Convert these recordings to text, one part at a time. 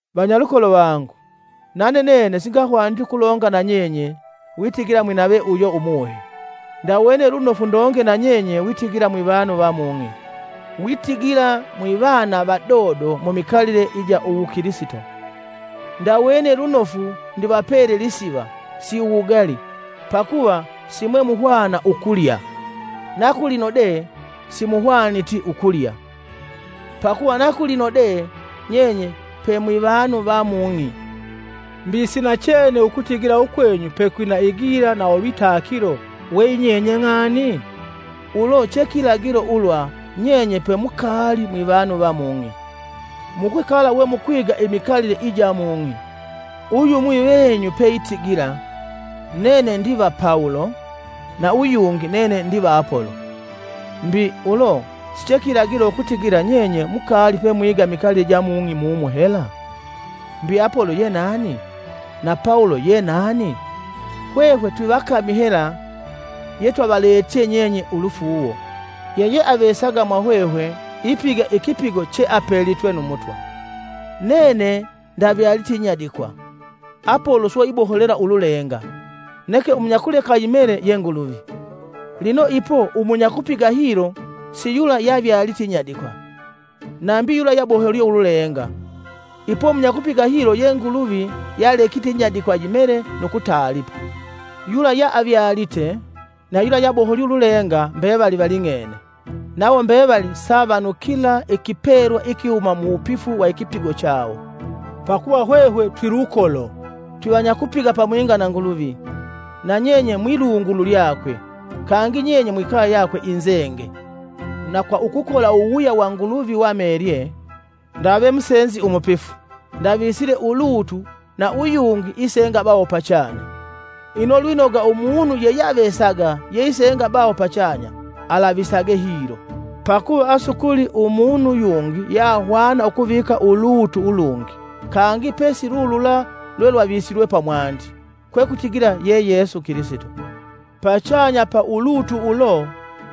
Vanyalukolo vangu, nane nene singahwaniti ukulonga nanye witigila mwinave uyo Umuhe. Ndawene lunofu ndonge nanye witigila mwivanu va mung'i, witigila mwivana vadodo mumikalile ija uwukilisito. Ndawene lunofu ndivapele lisiva, si uwugali, pakuva simwemuhwana ukulya. Na kulino de simuhwaniti ukulya, pakuva na kulino de nyenye pemwivanu va mung'i. Mbi si nachene ukutigila ukwenyu pekwina igila na ulwitakilo weyinyenye ng'ani? Ulo chekilagilo ulwa nyenye pemukaali mwivanu va mung'i, mukwikala we mukwiga imikalile ija mung'i. Uyumwi venyu peitigila, “Nene ndiva Pawulo.” na uyungi, “Nene ndiva Apolo,” mbi, ulo sichekilagilo ukutigila nyenye mukaali pemwiga imikalile ija mung'i mumu hela? Mbi Apolo ye nani? Na Pawulo yenani? Hwehwe twivakami hela yetwavaletye nyenye ulufuuwo. Yeyeavesaga mwahwehwe ipiga ikipigo che apelitwe nu Mutwa. Nene ndavyalite inyadikwa, Apolo swe iboholela ululenga; neke umunyakuleka yimele ye Nguluvi. Lino ipo umunyakupiga hilo si yula yavyalite inyadikwa, nambi yula yaboholye ululenga, ipo munyakupiga hilo ye Nguluvi yalekite inyadikwa yimele nu kutaalipa. Yula yeavyalite na yula yaboholye ululenga mbevali valing'ene, nawo mbevali savanukila ikipelwa ikihuma muwupifu wa ikipigo chawo. Pakuva hwehwe twilukolo, twivanyakupiga pamwinga na Nguluvi, na nyenye mwilungulu lyakwe, kangi nyenye mwikaye yakwe inzenge. Na kwa ukukola uwuwuya wa Nguluvi wamelye, ndawe musenzi umupifu, ndavisele ulutu na uyungi isenge baho pachanya. Ino lwinoga umunu yeyeavesaga yeisenga baho pachanya, alavisage hilo. Pakuva asukuli umunu yungi yeahwana ukuvika ulutu ulungi kangi pe silulula lwelwavisilwe pamwandi, kwekutigila ye Yesu Kilisito. Pachanya pa ulutu ulo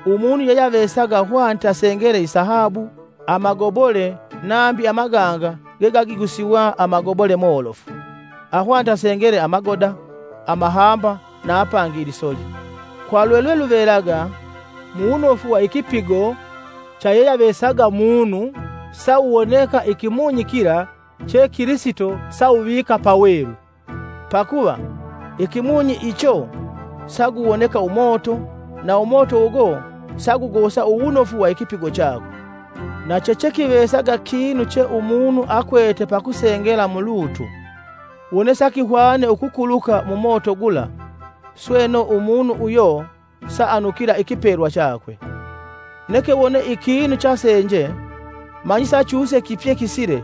umunu yeyeavesaga ahwanite asengele isahabu, amagobole nambi amaganga gegagigusiwa amagobole molofu; ahwanite asengele amagoda, amahamba na apangi ilisoli. Kwa lwelweluvelaga, muwunofu wa ikipigo cha yeyeavesaga munu sawuwoneka ikimunyi kila che Kilisito sawuvika pelu. Pakuva, ikimunyi icho saguwoneka umoto, na umoto ugo sagugosa uwunofu wa ikipigo chakwe. Na chechekivesaga kinu che umunu akwete pakusengela mulutu, wone sakihwane ukukuluka mu moto gula, sweno umunu uyo saanukila ikipelwa chakwe, neke wone ikinu chasenje, manyi sachuse kipye kisile,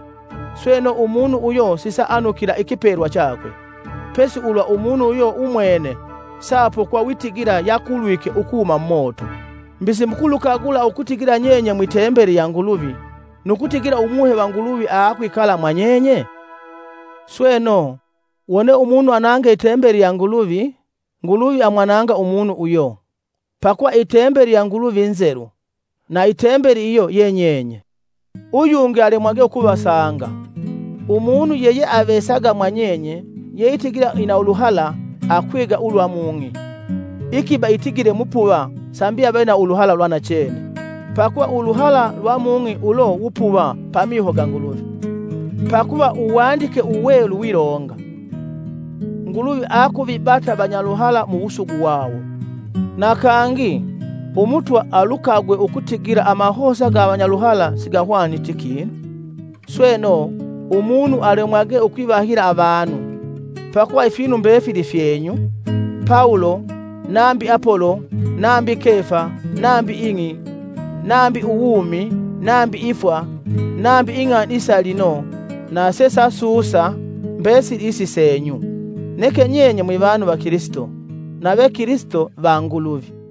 sweno umunu uyo sisaanukila ikipelwa chakwe, pesi ulwa umunu uyo umwene, saapokwa witigila yakulwike ukuhuma mumoto. Mbi, simukulukagula ukutigila nyenye mwitembeli ya Nguluvi, nu kutigila Umuhe va Nguluvi aakwikala mwa nyenye? Sweno, wone umunu anange i tembeli ya Nguluvi, Nguluvi amwananga umunu uyo; pakuva i tembeli ya Nguluvi nzelu, na i tembeli iyo ye nyenye. Uyungi alemwage ukuvasanga! Umunu yeyeavesaga mwa nyenye yeitigila ina uluhala aakwiga ulwa mung'i, ikiba itigile mupuva sambi ave na uluhala lwa nachene. Pakuva uluhala lwa mung'i ulo wupuva pamiho ga Nguluvi. Pakuva Uwandike Uwelu wilonga, “Nguluvi aakuvibata vanyaluhala mu wusugu wawo.” Na kangi, “Umutwa alukagwe ukutigila amahosa ga avanyaluhala sigahwaniti kinu.” Sweno, umunu alemwage ukwivahila avanu. Pakuva ifinu mbefili fyeenyu. Pawulo, nambi Apolo nambi Kefa, nambi ing'i, nambi uwumi nambi ifwa, nambi ing'ani isa lino na sesasusa, mbesili isi seenyu. Neke nyenye mwivanu va Kilisito, nave Kilisito va Nguluvi.